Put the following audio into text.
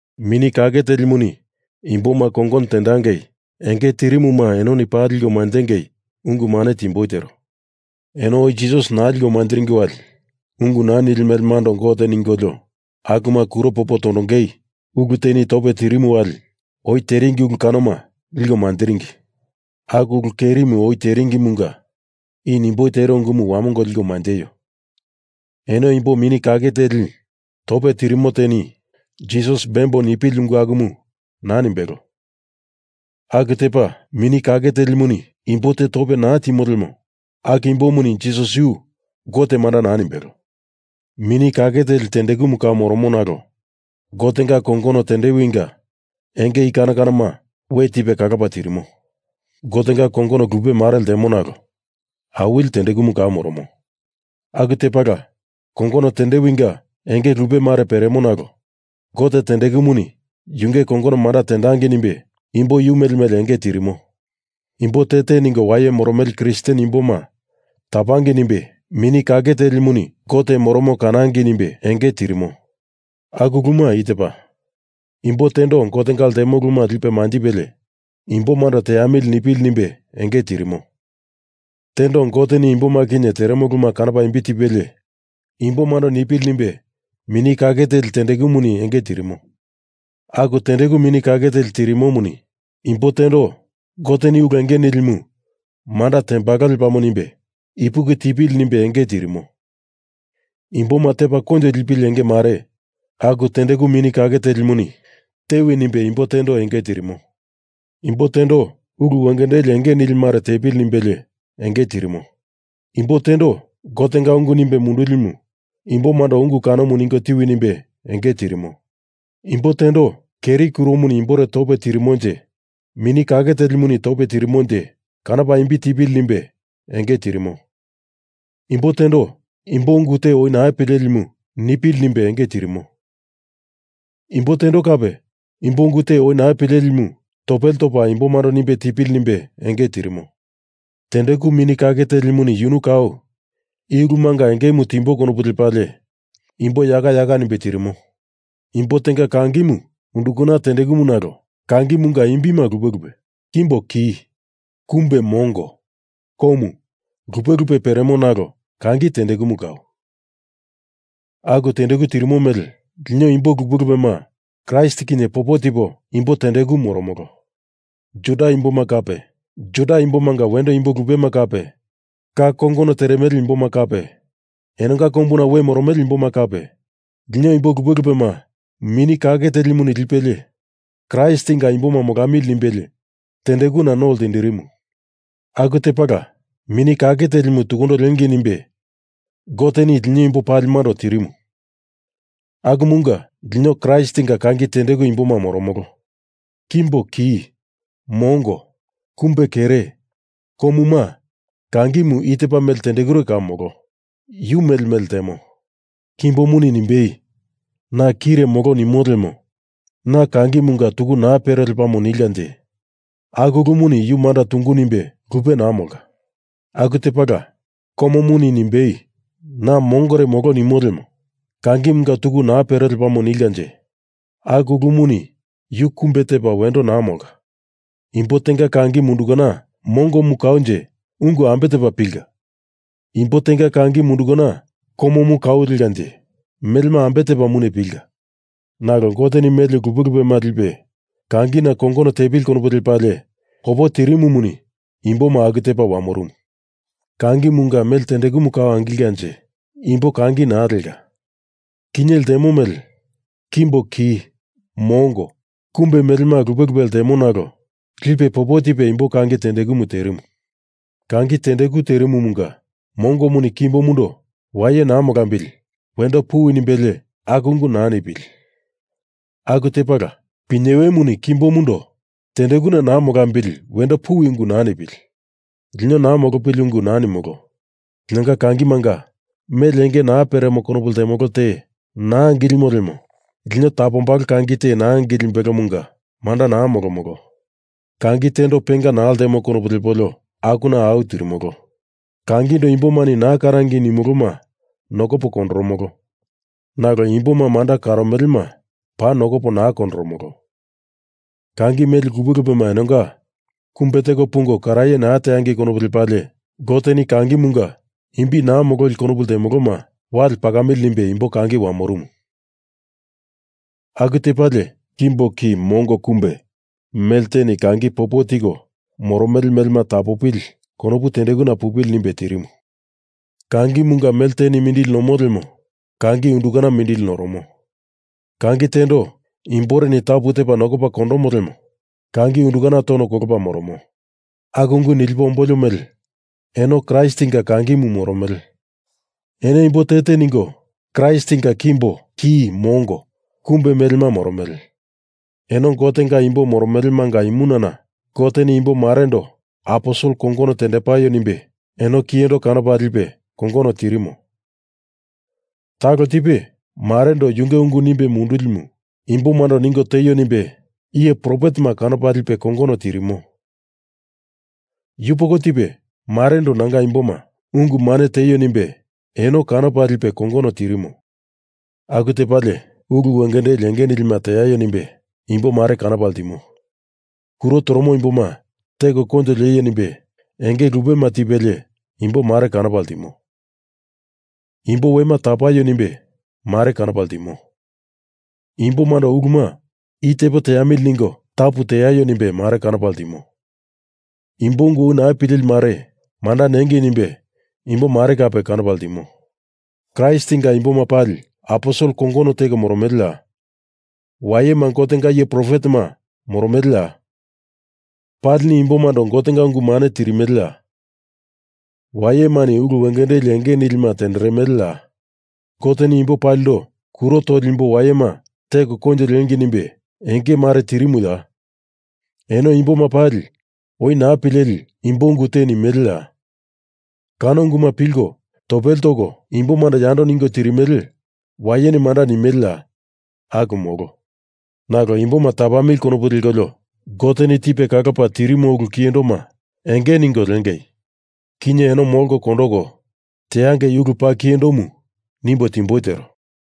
Mini Kake Telimuni imboma kongono tendangei enge tirimuma enoni paa liko manjengei ungu mane timboi tero. Eno oi Jisas naa liko manjiringi wali, ungu naa nili melemando gote ningolio akuma kuro popo tongei ulu teni tope tirimu wali oi teringi ulu kanoma liko manjiringi. Aku ulu kerimu oi teringimunga i nimboi tero ungumu wamongo liko manjeio. Eno imbo Mini Kake Teli tope tirimo teni Jisas bembo nipili ungu akumu naa nimbelo. Aku tepa Mini Kake Telimuni imbo te tope naa timo lemo aku imbomu Jisas yu Gote manda naa nimbelo. Mini Kake Teli tendekumu kau moromo nalo Gotenga kongono tendewinga enge i kano kanoma we tipe kalopa tirimo. Gotenga kongono lupe mare ltemo nalo Awili tendekumu kau moromo. Aku tepala kongono tendewinga enge lupe mare peremo nalo Gote tendekumuni yunge kongono manda tendangei nimbe imbo yu mele mele enge tirimo. Imbo te te ningoni waye moromele Kristen imboma tapangei nimbe Mini Kake Telimuni Gote moromo kanangei nimbe enge tirimo. Aku uluma i tepa. Imbo tendo Gotenga ltemo uluma lipe manjipelie imbomando teamili nipili nimbe enge tirimo. Tendo Goteni imboma kinye teremo uluma kanopa imbi tipelie imbomando nipili nimbe Mini Kake Teli tendekumuni enge tirimo. Aku tendeku Mini Kake Teli tirimomuni imbo tendo Goteni ulu enge nilimu manda tembalo lepamo nimbe ipuki tipili nimbe enge tirimo. Imboma tepa koinjo lipili enge mare aku tendeku Mini Kake Telimuni tewi nimbe imbo tendo enge tirimo. Imbo tendo ulu wengendeli enge nili mare tepili nimbelie enge tirimo. Imbo tendo Gotenga ungu nimbe mundulimu imbomando ungu kanomu ningo tiwi nimbe enge tirimo. Imbo tendo keri kuromuni imbore tope tirimonje Mini Kake Telimuni tope tirimonje kanopa imbi tipili nimbe enge tirimo. Imbo tendo imbo ungu te oi naa pilelimu nipili nimbe enge tirimo. Imbo tendo kape imbo ungu te oi naa pilelimu topele topa imbomando nimbe tipili nimbe enge tirimo. Tendeku Mini Kake Telimuni yunu kau i ulumanga engemu timboi konopu lepalie imbo yaka yaka nimbe tirimo. Imbo tenga kangimu undukana tendekumu nalo kangimunga imbima lupe lupe. Kimbo ki kumbe mongo komu lupe lupe peremo nalo kangi tendekumu kau. Aku tendeku tirimo mele, lino imbo lupe lupema Kraist kinye popo tipo imbo tendeku moromolo. Juda imboma kape Juda imbomanga wendo imbo lupema kape ka kongono teremele imboma kape enonga kombu we moromele imboma kape lino imbo lupe lupema Mini Kake Telemuni lipelie Kraistinga imboma molamili nimbelie tendekuna no ltindirimu. Aku tepala Mini Kake Telimu tukundo liengei nimbe Goteni lino imbo palimando tirimu. Akumunga lino Kraistinga kangi tendeku imboma moromolo. Kimbo ki mongo kumbe kere komuma kangimu i tepa mele tendekure kau molo. Yu mele mele ltemo. Kimbomuni nimbei, “Na kire molo nimo lemo na kangimunga tuku naa pero lepamo,” nilkanje aku ulumuni yu manda tungu nimbe lupe naa molka. Aku tepala komumuni nimbei, “Na mongore molo nimo lemo kangimunga tuku naa pero lepamo,” nilkanje aku ulumuni yu kumbe tepa yu wendo naa molka. Imbo tenga kangimu undukana mongomu kaunje ungu ambe tepa pilka? Imbo tenga kangimu undukana komumu kau lekanje melema ambe tepa mune pilka? Nalo Goteni mele lupe lupema lipe kangina kongono tepili konopu lepalie popo tirimumuni imboma aku tepa wamorumu. Kangimunga mele tendekumu kau angilkanje imbo kangi naa leka. Kinye ltemo mele, kimbo ki mongo kumbe melema lupe lupe ltemo nalo lipe popo tipe imbo kangi tendekumu terimu. Kangi tendeku terimumunga mongoni kimundo waye naa molambili, wendo puwi nimbelie aku ungu naa nipili. Aku tepala, pinyewemuni kimbondo tendekuna naa molambili wendo puwi ungu naa nipili. Lino naa molopili ungu naa nimolo. Linonga kangimanga mele enge naa peremo konopu ltemolo te naa angilimo lemo lino tapombalo kangi te naa angilimbelomunga manda naa molomolo. Kangi tendo penga naa ltemo konopu lepolio akuna au tirimolo. Kangindo imbomani naa kanangei nimoloma nokopo kondoromolo. Nalo imboma manda karomelema paa nokopo naa kondoromolo. Kangi mele lupe lupema enonga kumbe teko pungo karaye naa teangei konopu lepalie Goteni kangimunga imbi naa mololi konopu ltemoloma wale pakamili nimbe imbo kangi wamorumu. Aku tepalie kimbo ki mongo kumbe mele teni kangi popo tiko moromele melema tapopili konopu tendekuna pupili nimbe terimu. Kangimunga mele teni mindili nomo lemo kangi undukana mindili noromo. Kangi tendo imboreni tapu topa nokopa kondomo lemo kangi undukana tono kolopa moromo. Aku ungu nilipo ombolio mele eno Kraistinga kangimu moromele. Eno imbo te te ningo Kraistinga kimbo ki mongo kumbe melema moromele. Eno Gotenga imbo moromelemanga imunana Goteni imbo marendo aposel kongono tendepaio nimbe eno kiyendo kanopa lipe kongono tirimo. Talo tipe, marendo yunge ungu nimbe mundulimu imbomando ningo tieio nimbe iye profetema kanopa lipe kongono tirimo. Yupoko tipe, marendo nanga imboma ungu mane tieio nimbe eno kanopa lipe kongono tirimo. Aku tepalie, ulu wengendeli enge nilima teaio nimbe imbo mare kanopa ltimo. Kuro toromo imboma teko koinjo lieio nimbe enge lupema tipelie imbo mare kanopa ltimo. Imbo wema tapaio nimbe mare kanopa ltimo. Imbomando uluma i tepo teamili ningo tapu teaio nimbe mare kanopa ltimo. Imbo ungu oi naa pileli mare manda nengei nimbe imbo mare kape kanopa ltimo. Kraistinga imboma pali aposel kongono teko moromeleya? Wayema Gotenga iye profetema moromeleya? Palini imbomando Gotenga ungu mane tirimeleya? Wayemani ulu wengendeli enge nilima tenderemeleya? Goteni imbo palindo kuro toli imbo awinima teko koinjo lengei nimbe enge mare tirimuya? Eno imboma pali oi naa pileli imbo ungu te nimeleya? Kano unguma pilko topele toko imbomando yando ningo tirimele wayeni manda nimeleya? Aku molo. Nalo imboma tapamili konopu lekolio Goteni tipe kalopa tirimo ulu kiyendoma enge ningo liengei. Kinye eno molko kondoko teangei ulu paa kiyendomu nimbo timboi tero.